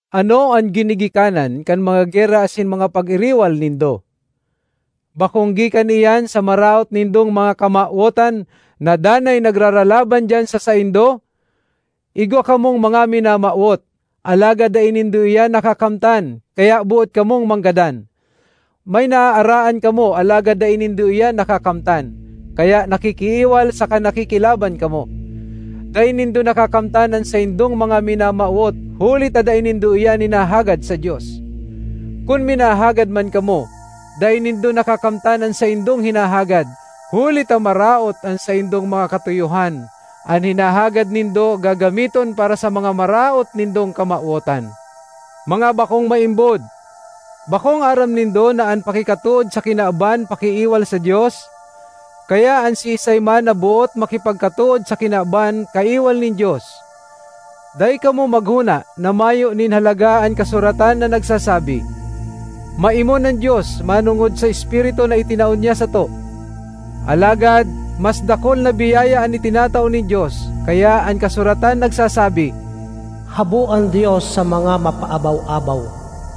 Ano an ginigikanan kan mga gera asin mga pag-iriwal nindo? Bakong gikan iyan sa maraot nindong mga kamawotan na danay nagraralaban diyan sa saindo? Igwa kamong mga minamawot, alagad dai nindo iyan nakakamtan, kaya boot kamong manggadan; may naaaraan kamo alagad dai nindo iyan nakakamtan, kaya nakikiiwal saka nakikilaban kamo. Dai nindo nakakamtan an saindong mga minamawot huli ta dai nindo iyan hinahagad sa Dios. Kun minahagad man kamo, dai nindo nakakamtan an saindong hinahagad, huli ta maraot an saindong mga katuyohan; an hinahagad nindo gagamiton para sa mga maraot nindong kamawotan. Mga bakong maimbod! Bakong aram nindo na an pakikatood sa kinaban, pakiiwal sa Dios? Kaya an siisay man na boot makipagkatood sa kinaban, kaiwal nin Dios. Dai kamo maghona na mayo nin halaga an kasuratan na nagsasabi, “Maimon an Dios manongod sa espiritu na itinao niya sato.” Alagad mas dakul na biyaya an itinatao nin Dios, kaya an kasuratan nagsasabi, “Habo an Dios sa mga mapaabaw-abaw,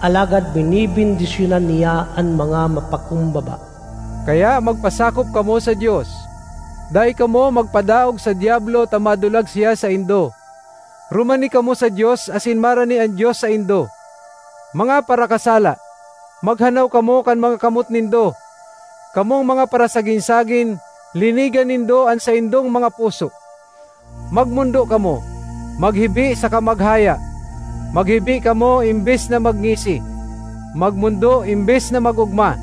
alagad benebendisyonan niya an mga mapakumbaba.” Kaya magpasakop kamo sa Dios. Dai kamo magpadaog sa Diablo ta madulag siya saindo. Rumani kamo sa Dios asin marani an Dios saindo. Mga parakasala, maghanaw kamo kan mga kamot nindo! Kamong mga parasagin-sagin, linigan nindo an saindong mga puso! Magmondo kamo, maghibi saka maghaya; maghibi kamo embes na magngisi, magmondo embes na mag-ogma.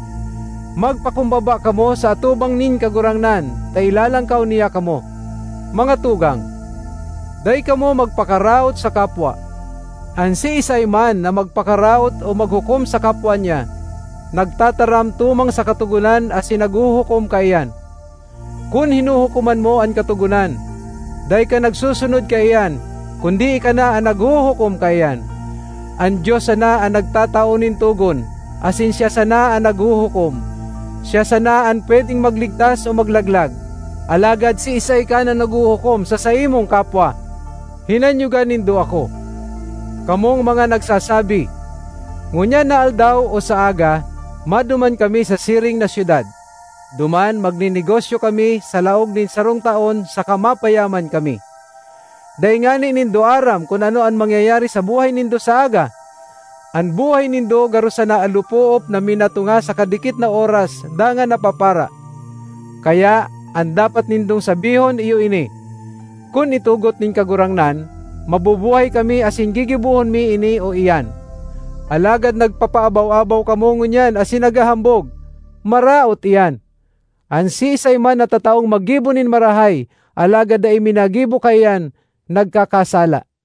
Magpakumbaba kamo sa atubang nin Kagurangnan, ta ilalangkaw niya kamo. Mga tugang, dai kamo magpakaraot sa kapwa. An siisay man na magpakaraot o maghukom sa kapwa niya, nagtataram tumang sa Katogonan asin naghuhukom kaiyan. Kun hinuhukoman mo an Katogonan, dai ka nagsusunod kaiyan, kundi ika na an naghuhukom kaiyan. An Dios sana an nagtatao nin togon asin siya sana an naghuhukom. Siya sana an pwedeng magligtas o maglaglag. Alagad siisay ka na naghuhukom sa saimong kapwa? Hinanyoga nindo ako, kamong mga nagsasabi, “Ngunyan na aldaw o sa aga, maduman kami sa siring na syudad; duman magnenegosyo kami sa laog nin sarong taon saka mapayaman kami.” Dai ngani nindo aram kun ano an mangyayari sa buhay nindo sa aga! An buhay nindo garo sana alopoop na minatunga sa kadikit na oras dangan napapara. Kaya an dapat nindong sabihon iyo ini: “Kun itugot nin Kagurangnan, mabubuhay kami asin gigibohon mi ini o iyan.” Alagad nagpapaabaw-abaw kamo ngunyan asin naghahambog; maraot iyan. An siisay man na tataong maggibo nin marahay alagad dai minagibo kaiyan, nagkakasala.